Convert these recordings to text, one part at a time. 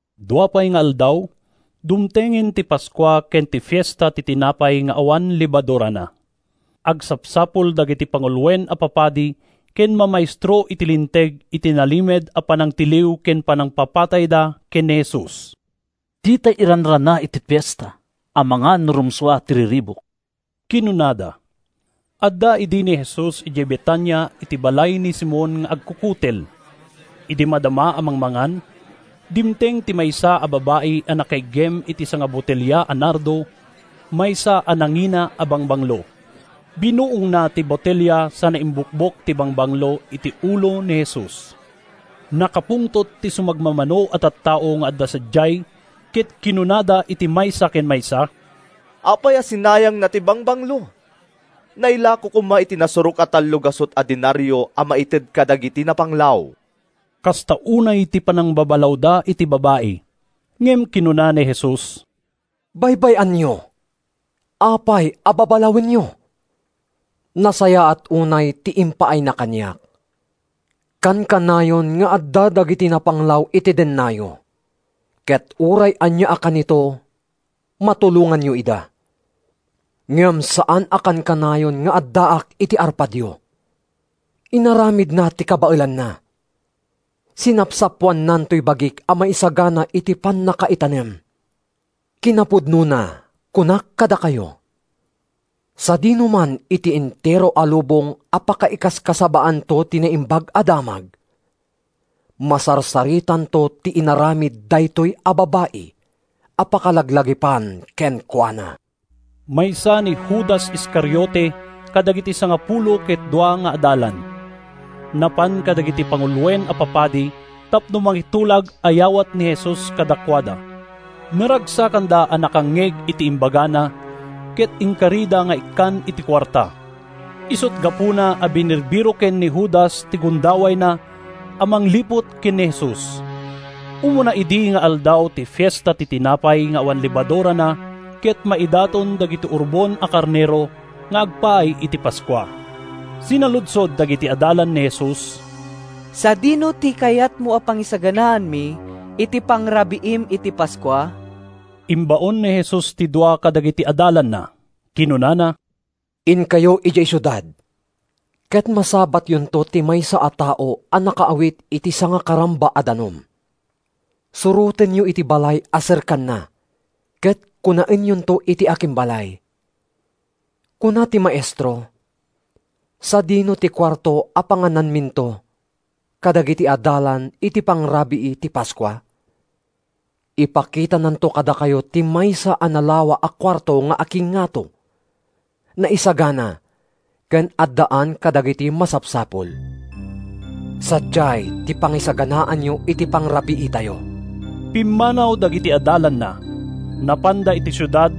Dua pay nga aldaw, dumtengen ti Paskua ken ti Fiesta ti Tinapay nga awan Lebadurana. Agsapsapul dagiti panguloen a papadi ken mamaestro iti Linteg iti nalimed a panangtiliw ken panangpapatayda ken ni Jesus. “Ditay iranrana iti fiesta, amangan no rumsua ti riribuk,” kinunada. Adda idi ni Jesus idiay Betania iti balay ni Simon nga agkukutel. Idi madama a mangmangan, dimteng ti maysa a babai a nakaiggem iti sangabotelia a nardo, maysa a nangina a bangbanglo. Binuongna ti botelia sana imbukbok ti bangbanglo iti ulo ni Jesus. Nakapungtot ti sumagmamano a tattao nga adda sadiay ket kinunada iti maysa ken maysa, “Apay a sinayangna ti bangbanglo? Nailako koma iti nasurok a tallogasut a denario a maited kadagiti napanglaw.” Kasta unay ti panangbabalawda iti babai, ngem kinuna ni Jesus, “Baybay-anyo! Apay a babalawenyo? Nasayaat unay ti impaayna kaniak. Kankanayon nga adda dagiti napanglaw iti dennayo, ket uray ania a kanito matulonganyo ida. Ngem saan a kankanayon nga addaak iti arpadyo. Inaramidna ti kabaelanna. Sinapsapoannan toy bagik a maisagana iti pannakaitanem. Kinapudnona, kunak kadakayo: Sadinoman iti entero a lubong a pakaikaskasabaanto ti Naimbag a Damag, masarsaritanto ti inaramid daytoy a babai a pakalaglagipan kenkuana.” Maysa ni Judas Iscariote kadagiti sangapulo ket dua nga adalan. Napan kadagiti panguloen a papadi tapno makitulag a yawatna ni Jesus kadakuada. Naragsakanda a nakangngeg iti imbagana, ket inkarida nga ikkan iti kuarta. Isut’ gapuna a binirbiroken ni Judas ti gundawayna a mangliput ken ni Jesus. Umuna idi nga aldaw ti Fiesta ti Tinapay nga awan Lebadurana ket maidaton dagiti urbon a karnero nga agpaay iti Paskua. Sinaludsod dagiti adalan ni Jesus, “Sadino ti kayatmo a pangisaganaanmi iti pangrabiim iti Paskua?” Imbaon ni Jesus ti dua kadagiti adalanna. Kinunana, “Inkayo idiay siudad ket masabatyonto ti maysa a tao a nakaawit iti sangakaramba a danum. Surotenyo iti balay a serkanna ket kunaenyonto iti akimbalay: ‘Kuna ti Maestro, Sadino ti kuarto a pangananminto kadagiti adalan iti pangrabii ti Paskua?’ Ipakitananto kadakayo ti maysa a nalawa a kuarto nga akingngato, naisagana ken addaan kadagiti masapsapul. Sadiay ti pangisaganaanyo iti pangrabiitayo.” Pimmanaw dagiti adalanna. Napanda iti siudad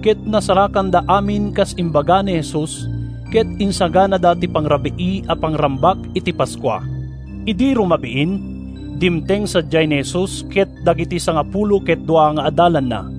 ket nasarakanda amin kas imbaga ni Jesus ket insaganada ti pangrabii a pangrambak iti Paskua. Idi rumabiin, dimteng sadiay ni Jesus ken dagiti sangapulo ket dua nga adalanna.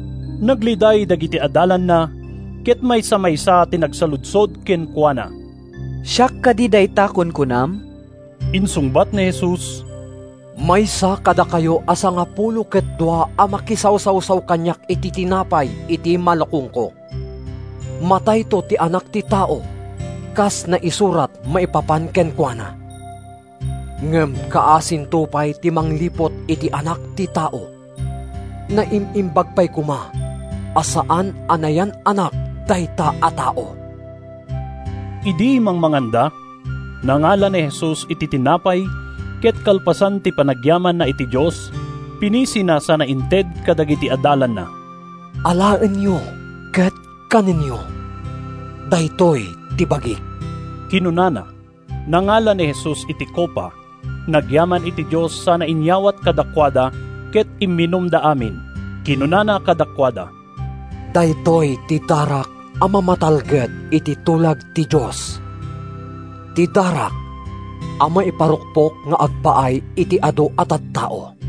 Nagliday dagiti adalanna ket maysa-maysa ti nagsaludsod kenkuana, “Siak kadi dayta kunkunam?” Insungbat ni Jesus, “Maysa kadakayo a sangapulo ket dua a makisawsawsaw kaniak iti tinapay iti malukongko. Matayto ti Anak ti Tao kas naisurat maipapan kenkuana, ngem kaasinto pay ti mangliput iti Anak ti Tao. Naim-imbag pay koma a saan a nayan-anak dayta a tao!” Idi mangmanganda, nangala ni Jesus iti tinapay ket kalpasan ti panagyamanna iti Dios, pinisina sana inted kadagiti adalanna. “Alaenyo ket kanenyo. Daytoy ti bagik,” kinunana. Nangala ni Jesus iti kopa, nagyaman iti Dios sana inyawat kadakuada, ket imminumda amin. Kinunana kadakuada: “Daytoy ti darak a mamatalged iti tulag ti Dios, ti darak a maiparukpok nga agpaay iti adu a tattao.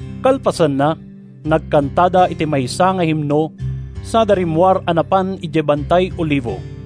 Kalpasanna, nagkantada iti maysa nga himno sada rimmuar a napan idiay Bantay Olivo.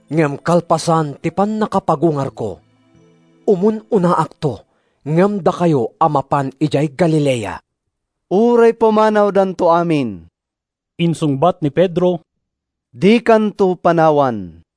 Ngem kalpasan ti pannakapagungarko, umun-unaakto ngem dakayo a mapan idiay Galilea.” “Uray pumanawdanto amin,” insungbat ni Pedro, “dikanto panawan.”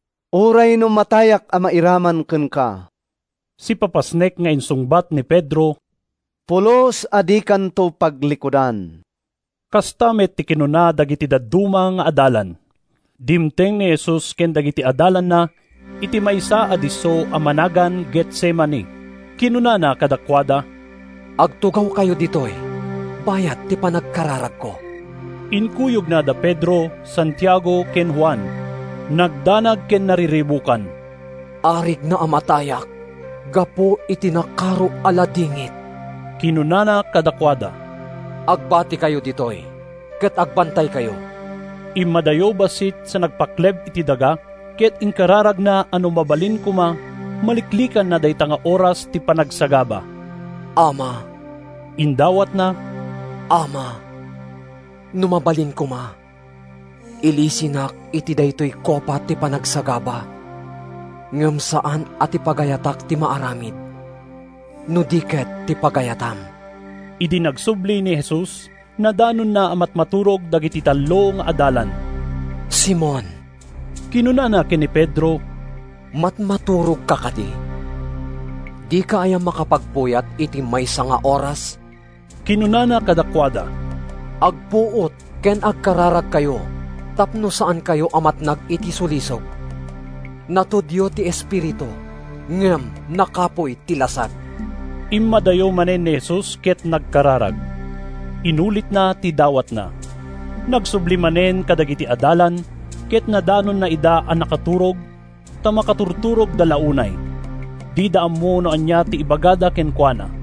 “Uray no matayak a mairaman kenka,” sipapasnek nga insungbat ni Pedro, “pulos a dikanto paglikudan.” Kasta met ti kinuna dagiti dadduma nga adalan. Dimteng ni Jesus ken dagiti adalanna iti maysa a disso a managan Getsemani. Kinunana kadakuada, “Agtugawkayo ditoy bayat ti panagkararagko.” Inkuyogna da Pedro, Santiago ken Juan. Nagdanag ken nariribukan. “Arigna a matayak gapu iti nakaro a ladingit,” kinunana kadakuada. “Agbatikayo ditoy ket agbantaykayo.” Immadayo bassit sa nagpakleb iti daga, ket inkararagna a no mabalin koma maliklikanna dayta nga oras ti panagsagaba. “Ama,” indawatna, “Ama, no mabalin koma, ilisinak iti daytoy kopa ti panagsagaba. Ngem saan a ti pagayatak ti maaramid, no di ket ti pagayatam.” Idi agsubli ni Jesus, nadanonna a matmaturog dagiti tallo nga adalan. “Simon,” kinunana ken ni Pedro, “matmaturogka kadi? Dika aya makapagpuyat iti maysa nga oras?” Kinunana kadakuada: “Agpuot ken agkararagkayo tapno saankayo a matnag iti sulisog. Natudio ti espiritu, ngem nakapuy ti lasag.” Immadayo manen ni Jesus ket nagkararag. Inulitna ti dawatna. Nagsubli manen kadagiti adalan ket nadanonna ida a nakaturog, ta makaturturogda la unay. Dida ammo no ania ti ibagada kenkuana.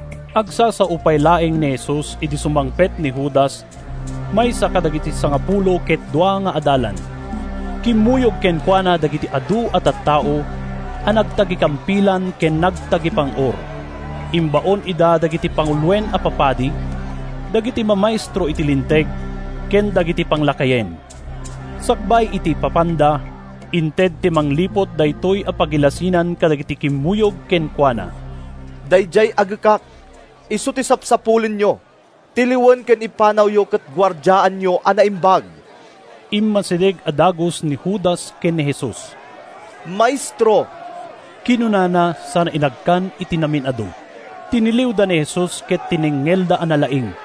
Agsasao pay laeng ni Jesus idi sumangpet ni Judas, maysa kadagiti sangapulo ket dua nga adalan. Kimmuyog kenkuana dagiti adu a tattao a nagtagikampilan ken nagtagipang-or. Imbaon ida dagiti panguloen a papadi, dagiti mamaestro iti Linteg, ken dagiti panglakayen. Sakbay ti ipapanda, inted ti mangliput daytoy a pagilasinan kadagiti kimmuyog kenkuana: “Daydiay agekak isu ti sapsapulenyo. Tiliwen ken ipanawyo ket guardiaanyo a naimbag.” Immasideg a dagus ni Judas ken ni Jesus. “Maestro!” kinunana sana inagkan iti namin-adu. Tiniliwda ni Jesus ket tinengngelda a nalaing.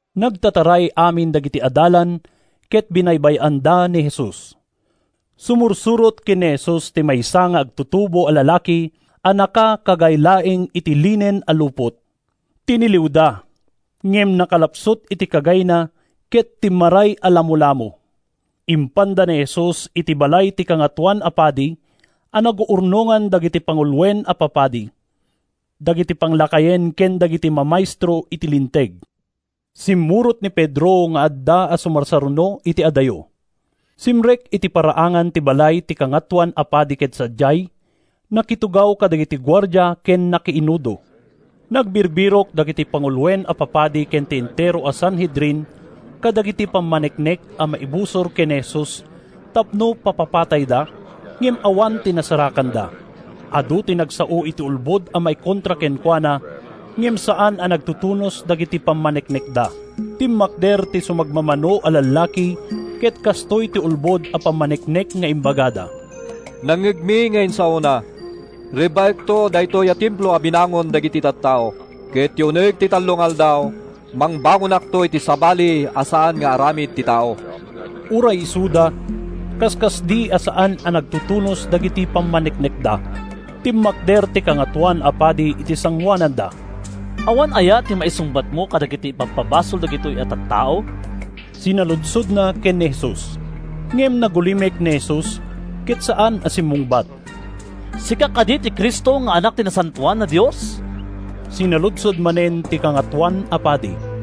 Nagtataray amin dagiti adalan ket binaybay-anda ni Jesus. Sumursurot ken ni Jesus ti maysa nga agtutubo a lalaki a nakakagay laeng iti linen a lupot. Tiniliwda, ngem nakalapsut iti kagayna ket timmaray a lamolamo. Impanda ni Jesus iti balay ti Kangatoan a Padi a naguurnongan dagiti panguloen a papadi, dagiti panglakayen ken dagiti mamaestro iti Linteg. Simmurot ni Pedro nga adda a sumarsaruno iti adayo. Simrek iti paraangan ti balay ti Kangatoan a Padi ket sadiay, nakitugaw kadagiti guardia ken nakiinudo. Nagbirbirok dagiti panguloen a papadi ken ti entero a Sanhedrin kadagiti pammaneknek a maibusor ken ni Jesus tapno papapatayda, ngem awan ti nasarakanda. Adu ti nagsao iti ulbod a maikontra kenkuana ngem saan a nagtutunos dagiti pammaneknekda. Timmakder ti sumagmamano a lallaki ket kastoy ti ulbod a pammaneknek nga imbagada: “Nangngegmi nga insaona, ‘Rebbaekto daytoy a Templo a binangon dagiti tattao, ket iti uneg ti tallo nga aldaw mangbangonakto iti sabali a saan nga aramid ti tao.’” Uray isuda kaskasdi a saan a nagtutunos dagiti pammaneknekda. Timmakder ti Kangatoan a Padi iti sangoananda. “Awan aya ti maisungbatmo kadagiti ipabpabasol dagitoy a tattao?” sinaludsodna ken ni Jesus. Ngem nagulimek ni Jesus ket saan a simmungbat. “Sika kadi ti Cristo nga Anak ti Nasantoan a Dios?” sinaludsod manen ti Kangatoan a Padi.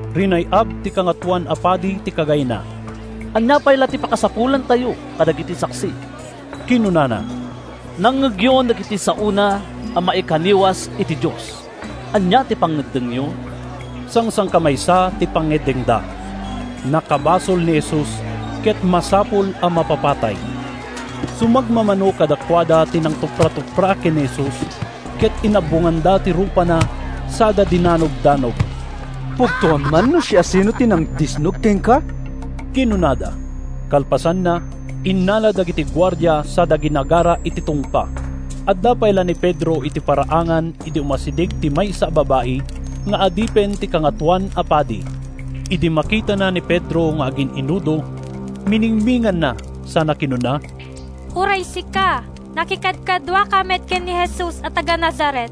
Rinay-ab ti Kangatoan a Padi ti kagayna. “Ania pay la ti pakasapulantayo kadagiti saksi?” kinunana. “Nangngegyon dagiti saona a maikaniwas iti Dios. Ania ti pangngeddengyo?” Sangsangkamaysa ti pangngeddengda: nakabasol ni Jesus ket masapul a mapapatay. Sumagmamano kadakuada ti nangtupratupra ken ni Jesus ket inabbonganda ti rupana sada dinanogdanog. “Pugtoam man no siasino ti nangdisnog kenka?” kinunada. Kalpasanna, innala dagiti guardia sada ginagara iti tungpa. Adda pay la ni Pedro iti paraangan idi umasideg ti maysa a babai nga adipen ti Kangatoan a Padi. Idi makitana ni Pedro nga agin-inudo, miningminganna sana kinuna, “Uray sika, nakikadkaduaka met ken ni Jesus a taga-Nazaret.”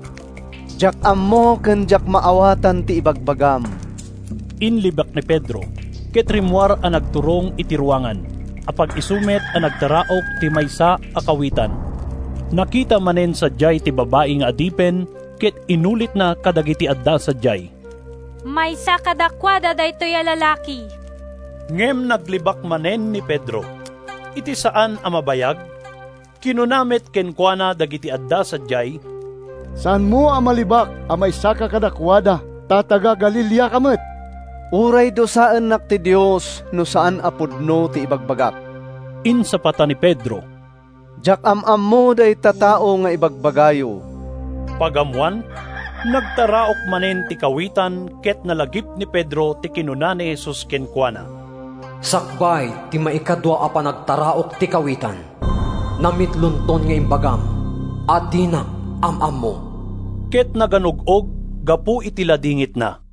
“Diak ammo ken diak maawatan ti ibagbagam,” inlibak ni Pedro. Ket rimmuar a nagturong iti ruangan. Apag-isu met a nagtaraok ti maysa a kawitan. Nakita manen sadiay ti babai nga adipen ket inulitna kadagiti adda sadiay, “Maysa kadakuada daytoy a lalaki!” Ngem naglibak manen ni Pedro. Iti saan a mabayag, kinuna met kenkuana dagiti adda sadiay, “Saanmo a mailibak a maysaka kadakuada, ta taga-Galileaka met.” “Uray dusaennak ti Dios no saan a pudno ti ibagbagak!” insapata ni Pedro. “Diak am-ammo dayta tao nga ibagbagayo!” Pagammoan, nagtaraok manen ti kawitan ket nalagip ni Pedro ti kinuna ni Jesus kenkuana: “Sakbay ti maikadua a panagtaraok ti kawitan, namitlonton nga imbagam a dinak am-ammo.” Ket naganug-og gapu iti ladingitna.